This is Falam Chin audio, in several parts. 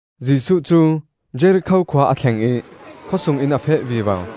Jesuh cu Jerikho khua a thleng ih khawsung in a feh vivo.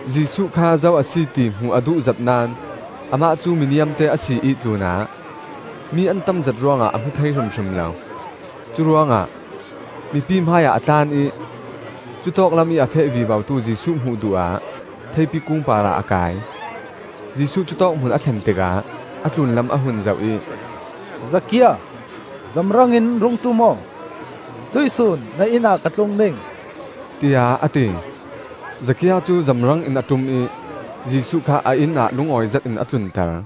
Jesuh kha zo a si ti hmuh a duhzet naón amah cu mi niamte a si ih tlunah mi an tamzet ruangah a hmu thei hrimhrim lo. Curuangah mipi hmaiah a tlan ih cutawk lamih a feh vivotu Jesuh hmuh duh ah theipi kung parah a kai. Jesuh cutawk hmun a thlen tikah a tlunlam a hun zoh ih, “Zakia, zamrangin rung ṭum aw, tuihsun na inn ah ka tlung ding,” tiah a ti. Zakia cu zamrangin a ṭum ih Jesuh kha a inn ah lungawi zetin a tlunter.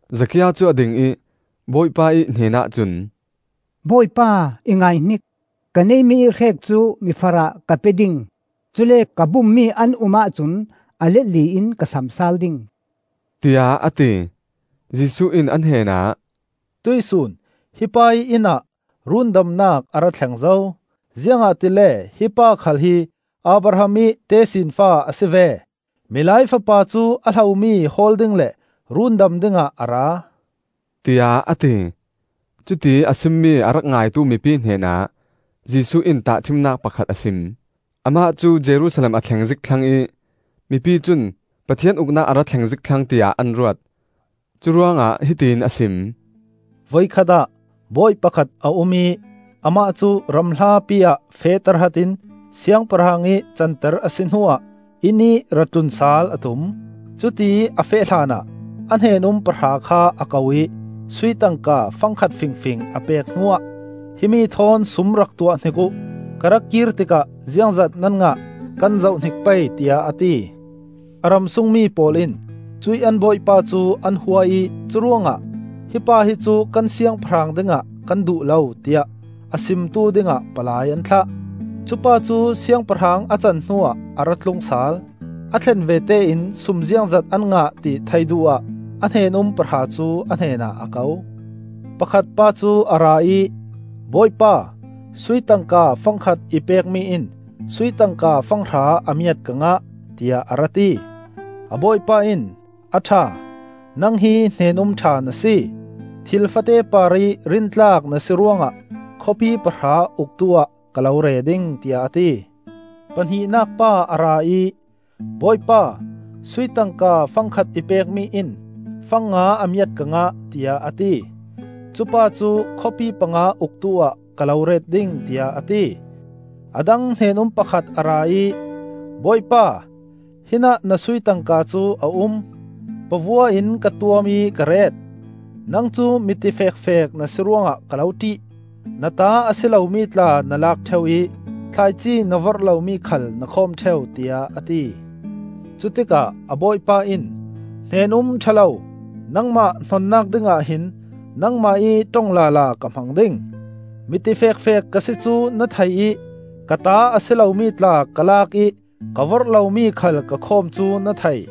Zakia cu a ding ih Bawipa ih hnenah cun, “Bawipa, i ngaihnik! Ka neihmi ih hrek cu mifarah ka pe ding; cule ka bummi an um ahcun a let li in ka sam sal ding,” tiah a ti. Jesuh in a hnenah, “Tuih sun hi pa ih inn ah rundamnak a ra thleng zo, ziangahtile hi pakhal hi Abraham ih tesinfa a si ve. Milai Fapa cu a hlomi hawl ding le rundam dingah a ra,” tiah a ti. Cutiih a simmi a rak ngaitu mipi hnenah Jesuh in tahṭhimnak pakhat a sim. Amah cu Jerusalem a thleng zik thlang ih mipi cun Pathian Uknak a ra thleng zik thlang tiah an ruat. Curuangah hiti in a sim: “Voikhat ah bawi pakhat a um ih amah cu ram hlapi ah feh tahratin siangpahrang ih canter a si hnuah innih ra tlun sal a tum. Cutiih a feh hlanah a hnen-um pahra kha a ko ih sui tangka fang khat fingfing a pek hnuah, ‘Himi thawn sum rak tuah hnik uh; ka ra kir tikah ziangzat nan ngah, kan zohhnik pei,’ tiah a ti. A ram sungmi pawl in cuih an bawipa cu an hua ih curuangah ‘Hi pa hi cu kan siangpahrang dingah kan duh lo,’ tiah a simtu dingah palai an thlah. “Cupa cu siangpahrang a can hnuah a ra tlung sal. A thlen vete in sum ziangzat an ngah ti theih duh ah a hnen-um pahra cu a hnenah a ko. Pakhat pa cu a ra ih, ‘Bawipa, sui tangka fang khat i pekmi in sui tangka fang hra a miat ka ngah,’ tiah a ra ti. A bawipa in, ‘A ṭha, nang hi hnen-um ṭha na si. Thil fate parih rintlak na si ruangah khawpi pahra uktu-ah ka lo re ding,’ tiah a ti. Pahnihnak pa a ra ih, ‘Bawipa, sui tangka fang khat i pekmi in fang nga a miat ka ngah,’ tiah a ti. Cupa cu ‘Khawpi panga uktu-ah ka lo ret ding,’ tiah a ti. “A dang hnen-um pakhat a ra ih, ‘Bawipa, hinah na sui tangka cu a um. Pavua in ka tuam ih ka ret. Nang cu mi tifekfek na si ruangah ka lo ṭih. Na ta a si lomi tla na lak ṭheu ih thlaici na vorh lomi khal na khawm ṭheu,’ tiah a ti. Cutikah a bawipa in, ‘Hnen-um ṭha lo! Nangmah hnonnak dingah hin nangmah ih ṭong lala ka hmang ding! Mi tifekfek ka si cu na thei ih ka ta a si lomi tla ka lak ih ka vorh lomi khal ka khawm cu na thei.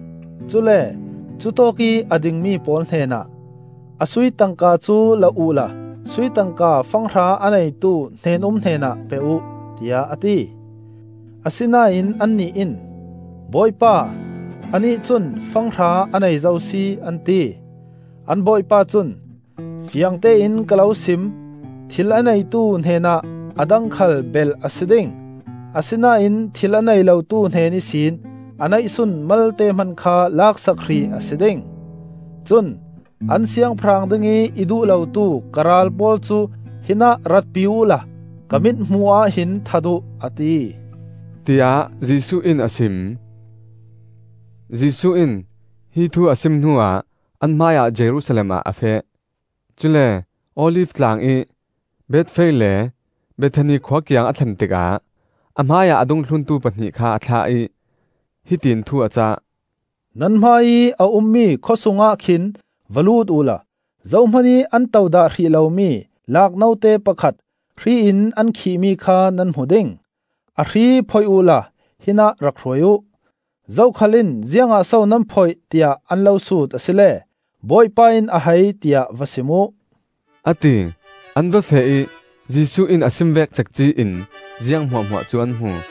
Cule cutawkih a dingmi pawl hnenah, ‘A sui tangka cu la uhla sui tangka fang hra a neitu hnen-um hnenah pe uh,’ tiah a ti. Asinain annih in, ‘Bawipa, anih cun fang hra a nei zo si!’ an ti. An bawipa cun, ‘Fiangtein ka lo sim: thil a neitu hnenah a dang khal belh a si ding; asinain thil a nei lotu hnen ihsin a neihsun malte hman kha laksak hrih a si ding. Cun an siangpahrang dingih i duh lotu ka ral pawl cu hinah ratpi uh la ka mithmuh ah hin that uh,’ a ti,” tiah Jesuh in a sim. Jesuh in hi thu a sim hnuah an hmaiah Jerusalem ah a feh. Cule Olif tlang ih Bethphage le Bethani khua kiang a thlen tikah a hmai ah a dungthluntu pahnih kha a thlah ih, hiti in thu a cah. “Nan hmaiih a ummi khawsungah khin va lut uhla zohman ih an to dah hrih lomi laak note pakhat hri in an khihmi kha nan hmu ding. A hri phoih uhla hinah rak hruai uh. Zokhal in ziangah so nan phoih, tiah an lo sut asile Bawipa in a hai tiah va sim uh,” a ti. An va feh ih Jesuh in a sim vek cekci-in ziang hmuahhmuah cu an hmu.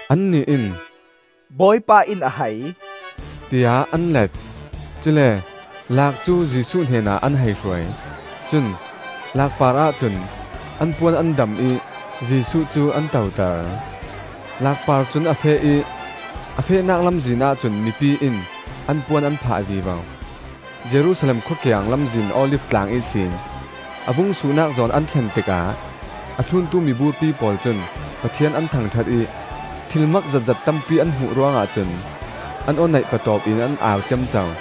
Annih in, “Bawipa in a hai,” tiah an let. Cule laak cu Jesuh hnenah an hei hruai. Cun laak parah cun an puan an dam ih Jesuh cu an toter. Laak par cun a feh ih a fehnak lamzin ahcun mipi in an puan an phah vivo. Jerusalem khua kiang lamzin Olif Tlang ihsin a vung suhnak zawn an thlen tikah a thluntu miburpi pawl cun Pathian an thangṭhat ih, thil mak zetzet tampi an hmuh ruangah cun an aw neih patawp in an au ciamco.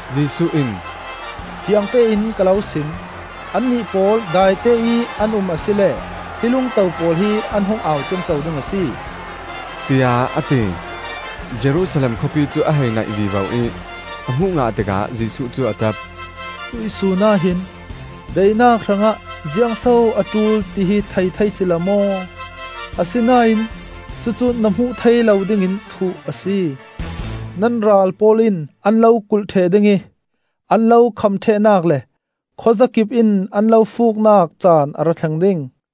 Jesuh in, “Fiangtein ka lo sim: Annih pawl daiteih an um asile hi lungto pawl hi an hung au ciamco ding a si,” tiah a ti. Jerusalem khawpi cu a hei naih vivo ih a hmuh ngah tikah Jesuh cu a ṭap: “Tuihsun ah hin daihnak hrangah ziangso a ṭul, tihi thei thei cila maw! Asinain cucu na hmuh thei lo dingin thuh a si! Nan ral pawl in an lo kulh ṭheh ding ih an lo kham ṭhehnak le khuazakip in an lo fuuknak caan a ra thleng ding.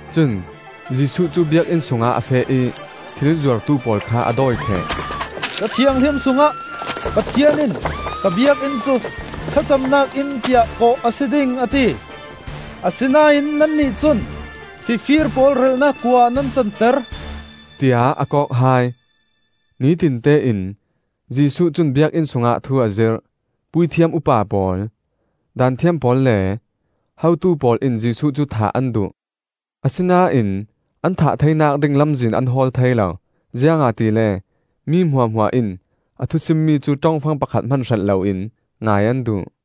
Cun Jesuh cu Biakinn sungah a feh ih thil zuartu pawl kha a dawi ṭheh. “Ca Thianghlim sungah Pathian in ka Biakinn cu thlacamnak inn tiah kawh a si ding a ti. Asinain nannih cun fifir pawl relhnak kua ah nan canter!” tiah a kawk hai. Nitinte in Jesuh cun Biakinn sungah thu a zirh. Puithiam upa pawl, Daanthiam pawl le hotu pawl in Jesuh cu thah an duh. Asinain an thah theinak ding lamzin an hawl thei lo, ziangahtile mi hmuahhmuah in a thu simmi cu ṭongfang pakhat hman hrelh loin ngai an duh.